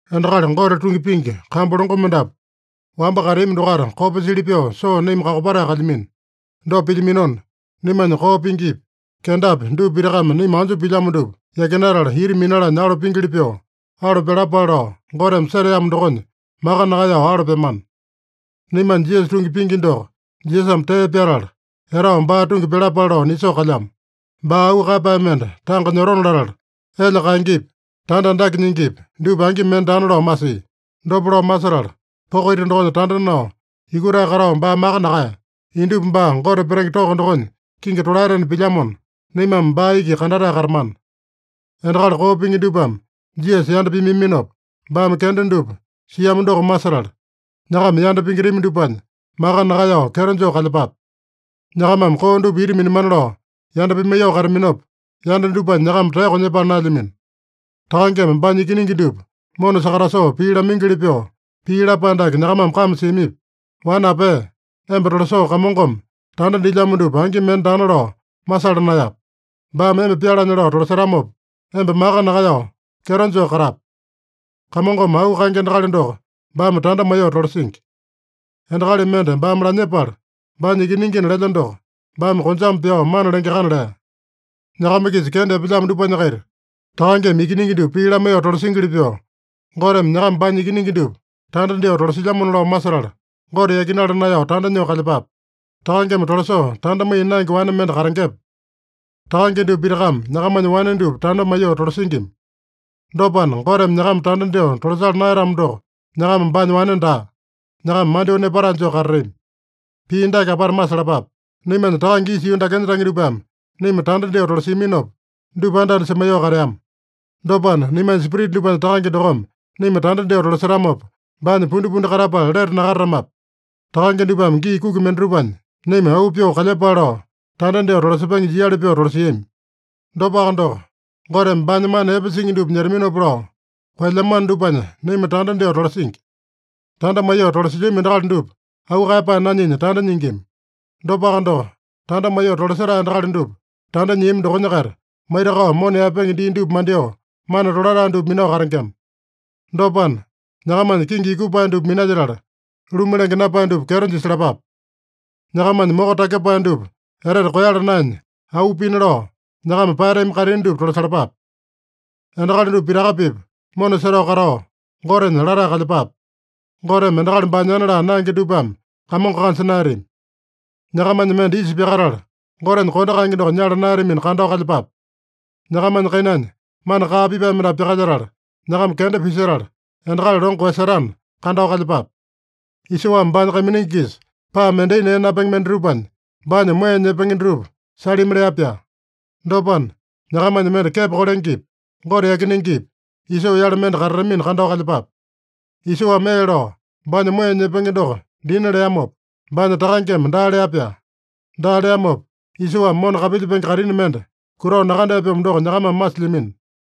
Endakali Gote tungi pingi kambu longo mendapu, wamba kateami dokaita kopa sili pyoo soo naima kakopatae kalyamino. Dopa pilyaminona, naimanya koo pingipi, kendapi dupa pitakame naima anjo pilyamo dupa yakinatala, ita minalanya alo pingili pyoo, alo pyalapale lao Goteme seteamo dokonya, maka nakaeyao alo pyamana. Naimanya Jisasa tungi pingi doko Jisasame tee pyatala, etao baa tungi pyalapale lao nisoo kalyamo. Baa auu kaeyapae mende tanga nyotona latala, elya kaengepi, tanda andake nyingipi, dupa angi mende daana lao masia. Dopa lao masetala, poko ita dokonya tanda nao, yukutae katao baa maka nakaeya. Indupa baa Gote petenge toko dokonya kingi tolaetena pilyamona, naimame baa iki kandatae katamana. Endakali koo pingi dupame Jisasa yanda pimaiyaminopa, baame kenda dupa siamo doko masetala, nyakama yanda pingitami dupanya maka nakaeyao kyeto joo kalyepape. Nyakamame koo dupa ita minamana lao yanda pimaiyoo kataminopa, yanda dupanya nyakama taeyoko nyepala naelyamino. Takangeme baanya ikiningi dupa mona sakatasoo pii lamaingili pyoo pii lapae dake nyakamame kame siamipi? “Wane apea, emba tolasoo Kamongome tanda dilyamo dupa angi mende daana lao masala naeyape. Baame emba pyalanya lao tolasetamopa, emba maka nakaeyao kyeto joo katape. Kamongome auu kaenge endakali doko baame tanda maiyoo tolasingi. Endakali mende baame lanyepala, baanya ikiningina lelya doko, baame konjame pyao mana lengeakana” lea. Nyakama-kisa kenda epelyamo dupanya-kaita, takangeme ikiningi dupa pii lamaiyoo tolasingili pyoo, Goteme nyakama baanya ikiningi dupa tanda dyoo tolasilyamona lao masetala, Gote yakinala naeyao tanda nyoo kalyepape. Takangeme tolasoo tanda maiya naenge wane mende katengepe? Takange dupa pitakame nyakamanya wane dupa tanda maiyoo tolasingima. Dopana, Goteme nyakama tanda dyoo tolasala naeyatamo doko, nyakama baanya wane daa. Nyakama mandyoo nepatae joo katatami. Pii dake apata masalapape: Naimanya takange isa yuu dakenya tange dupame naima tanda dyoo tolasiaminopa, dupa anda-anda semaiyoo kateama. Dopana, naimanya spirita dupanya Takange dokome naima tanda dyoo tolasetamopa, baanya pundipundi katapala lete nakatatamape? Takange dupame gii kuki mendatupanya naima auu pyoo kalyepale lao, tanda dyoo tolasepenge jiali pyoo tolasiami. Dopaka doko, Goteme baanya mana epe singi dupa nyetaminopa lao, koelyamano dupanya naima tanda dyoo tolasingi. Tanda maiyoo tolasilyami endakali dupa auu kaeyapae nanyinya tanda nyingima. Dopaka doko, tanda maiyoo tolasetae endakali dupa tanda nyiami dokonya-kaita, maitakao mona yaepenge dii dupa mandyoo, mana tolatae dupa minao katengema. Dopana, nyakamanya kingi yukupae dupa minalyetala, luma lenge napae dupa kyeto jisalapape. Nyakamanya moko takyepae dupa etete koeyala naenya auu pina lao, nyakama paeyatami kaitini dupa tolasalapape. Endakali dupa pitaka-pipa mona setao katao, Gotenya latae kalyepape. Goteme endakali baanyana laa naenge dupame Kamongo kanja naeyatami. Nyakamanya mende isa pyakatala, Gotenya kondo kaenge doko nyala naeyatamina, kandao kalyepape. Nyakamanya kainanya mana kaa pipae mendapu pyakalyetala, nyakama kenda pisetala, endakali longo koeyasetana, kandao kalyepape. Isoame baanya kaiminingi-kisa paa mendai nee napenge mendatupanya baanya moeya nyepenge dutupa salimi lea-pyaa. Dopana, nyakamanya mende kepo kolengepi, Gote yakinengepi, Isoo-yale mende katatamina kandao kalyepape. Isoame ee lao, baanya moeya nyepenge doko dina leamopa, baanya takangeme daa lea-pyaa. Daa leamopa, Isoame mona kapilyepenge kaitini mende kutao nakandea-pyomo doko nyakamame masilyamino.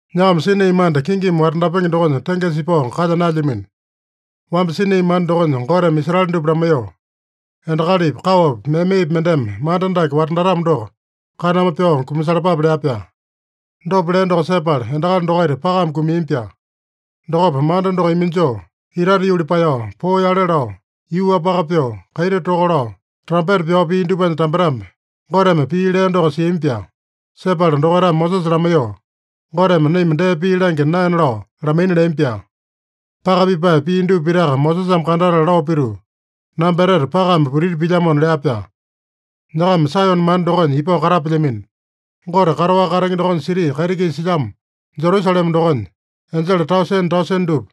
Nyakama Sinai manda kingimi watandapenge dokonya tengesa ipao kalya naelyamino. Wamba Sinai manda dokonya Goteme Israele dupa lamaiyoo, “Endakalipi, kaowapi, memepi mendeme manda dake watandatamo doko, kaname pyao kumasalapape” lea-pyaa. Dopa lea doko sepala, endakali dokaita pakame kumiami-pyaa. Dokopa manda doko iminjoo, itate yuli paeyao, poo yale lao, yuu-wapaka pyoo, kaiti toka lao, trampeta pyao pia dupanya tambetambe, Goteme pii lea doko siami-pyaa. Sepala dokaitame Mosesa lamaiyoo, Goteme naima dee pii langya naena lao lamaina leami-pyaa. Paka pipae pia dupa pitaka Mosesame kandatala lao pituu, “Namba etete pakame putiti pilyamona” lea-pyaa. Nyakama Saeyone manda dokonya ipao katapelyamino. Gote kataowaka katenge dokonya siti kaiti-kisa silyamo Jerusalema dokonya, enjele tausene-tausene dupa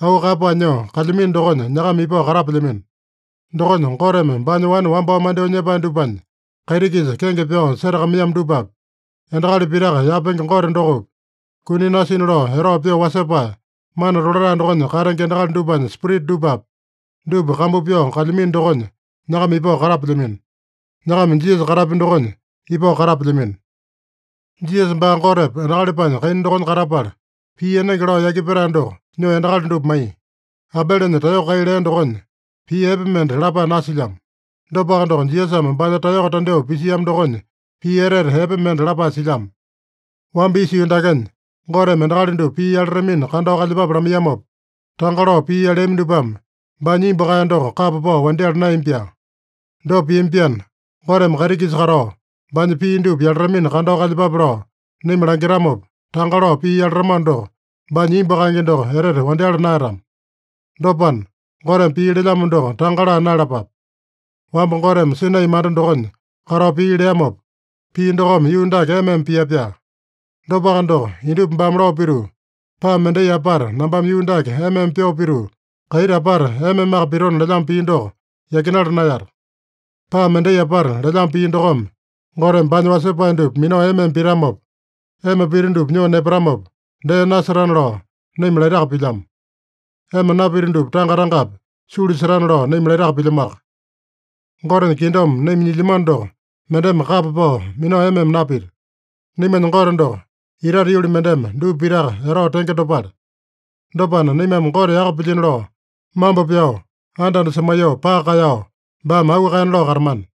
auu kaeyapae nyoo kalyamino dokonya nyakama ipao katapelyamino. Dokonya Goteme baanya wane wambao mandyoo nyepae dupanya, kaiti-kisa kenge pyao setakamaiyamo dupapi, endakali pitaka yapenge Gote dokopi, kuni nasina lao etao pyoo wasepae, mana tolatae dokonya katenge endakali dupanya spirita dupapi, dupa kambu pyao kalyamino dokonya nyakama ipao katapelyamino. Nyakama Jisasa katapya dokonya ipao katapelyamino. Jisasa baa Gotepa, endakalipanya kaina dokonya katapala, pii enenge lao yaki petae doko nyoo endakali dupa maiya. Abelenya taeyoko kai lea dokonya, pii epe mende lapae nasilyamo. Dopaka doko, Jisasame baanya taeyoko tandyoo pisiamo dokonya, pii etete epe mende lapae silyamo. Wamba isa yuu dakenya Goteme endakali dupa pii yalatamina kandao kalyepape lamaiyamopa, tanga lao pii yaleami dupame baanya imbu kaeya doko kapa pao wandyala naeyami-pyaa. Dopa piami-pyaana, Goteme kaiti-kisa katao, baanya pii dupa yalatamina kandao kalyepape lao naima langitamopa, tanga lao pii yalatamano doko, baanya imbu kaenge doko etete wandyala naeyatama. Dopana, Goteme pii lelyamo doko tanga laa naeyalapape. Wamba Goteme Sinai manda dokonya katao pii leamopa, pii dokome yuu dake ema-ema pia-pyaa. Dopaka doko, indupa baame lao pituu, “Paa mendai apata nambame yuu dake ema-ema pyoo pituu, kaiti apata ema-emaka pitona” lelyamo pii doko yakinala naeyata. “Paa mendai apata” lelyamo pii dokome, Goteme baanya wasepae dupa minao ema-ema pitamopa, ema pita dupa nyoo nepatamopa dee nasetana lao naima laitaka pilyamo. Ema napita dupa tanga-tangapi sulu setana lao naima laitaka pilyamoaka. Gotenya kingdom naima nyilyamano doko mendeme kapa pao minao ema-ema napita. Naimanya Gote doko, itate yuli mendeme dupa pitaka etao tenge dopale. Dopana, naimame Gote yaka pilyino lao, mambo pyao, anda-anda semaiyoo, paka kaeyao, baame auu kaena lao katamana.